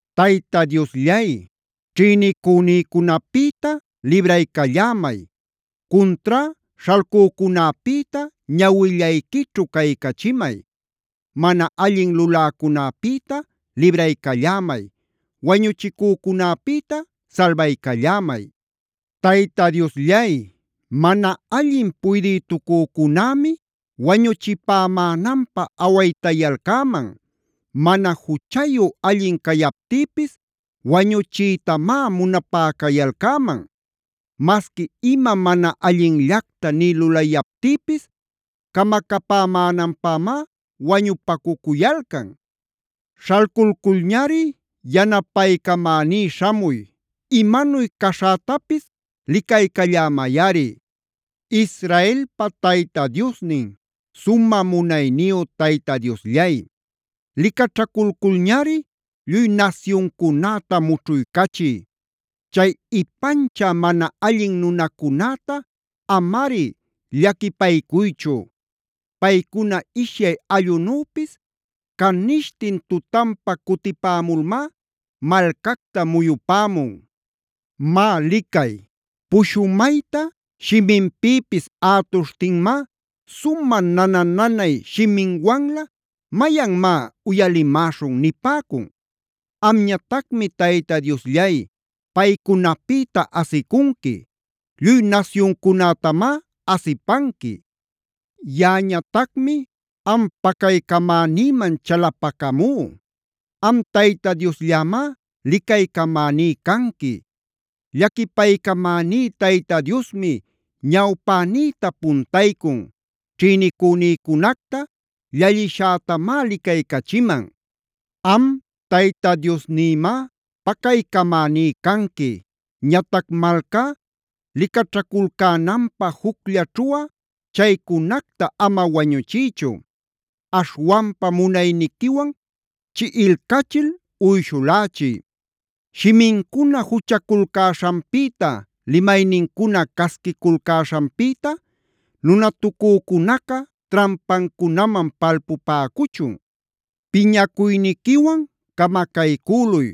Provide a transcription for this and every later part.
Tayta Diosllay, ćhïnicünïcunapïta libraycallämay. Cuntrá śhalcücunäpïta ñawillayquićhu caycachimay. Mana allin luläcunäpïta libraycallämay. Wañuchicücunäpïta salbaycallämay. Tayta Diosllay, mana allin puydïtucücunämi wañuchipämänanpä awaytayalcäman. Mana juchayu allin cayaptïpis wañuchiytamá munapayalcäman. Masqui ima mana allinllacta nï lulayaptïpis camacapämänanpämá wañupacuyalcan. Śhalculculñari yanapaycamäní śhamuy. Imanuy caśhätapis licaycallämayꞌari. Israelpa Tayta Diosnin, sumä munayniyu Tayta Diosllay, licaćhaculculñari lluy nasyuncunäta mućhuycachiy. Chay ipanchä mana allin nunacunäta amari llaquipaycuychu. Paycuna ishyay allꞌunüpis canishtin tutanpa cutipämulmá malcacta muyupämun. Má licay, pushumayta shiminpïpis ätuśhtinmá sumä nana-nanay shiminwanlä: “¡Mayanmá uyalimäśhun!” nipäcun. Amñatacmi Tayta Diosllay, paycunapïta asicunqui.b Lluy nasyuncunätamá asipanqui. Yaꞌañatacmi am pacaycamänïman chalapacamú. Am Tayta Diosllämá licaycamäní canqui. Llaquipaycamäní Tayta Diosmi ñawpänïta puntaycun. Ćhïnicünïcunacta llallishätamá licaycachiman. Am Tayta Diosnïmá pacaycamäní canqui. Ñatac malcá licaćhaculcänanpä jucllaćhuꞌa chaycunacta ama wañuchiychu. Aśhwanpa munayniquiwan chiꞌilcachil uyshulächiy. Shimincuna juchaculcäśhanpïta, limaynincuna casquiculcäśhanpïta nunatucücunaca trampancunaman palpupäcuchun. Piñacuyniquiwan camacaycüluy.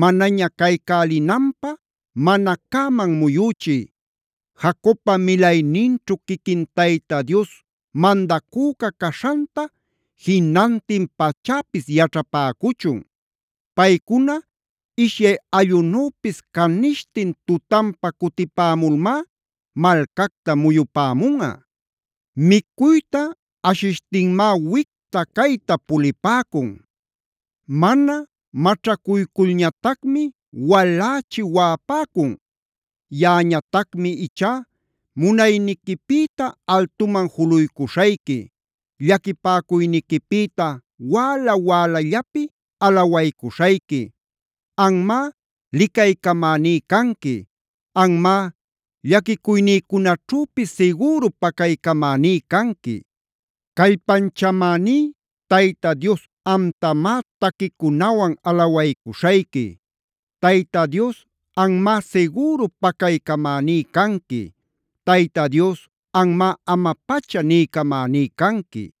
Manaña caycälinanpä mana cäman muyüchiy. Jacobpa milayninćhu quiquin Tayta Dios mandacüca caśhanta jinantin pachäpis yaćhapäcuchun. Paycuna ishyay allꞌunüpis canishtin tutanpa cutipämulmá malcacta muyupämunꞌa. Micuyta ashishtinmá wicta-cayta pulipäcun. Mana maćhacuyculñatacmi walächi waꞌapäcun. Yaꞌañatacmi ichá munayniquipïta altuman juluycuśhayqui. Llaquipäcuyniquipïta wäla-wälallapi alawaycuśhayqui. Anmá licaycamäní canqui. Anmá llaquicuynïcunaćhüpis sigüru pacaycamäní canqui. Callpanchamäní Tayta Dios amtamá taquicunawan alawaycuśhayqui. Tayta Dios anmá sigüru pacaycamäní canqui. Tayta Dios anmá ama-pacha niycamäní canqui.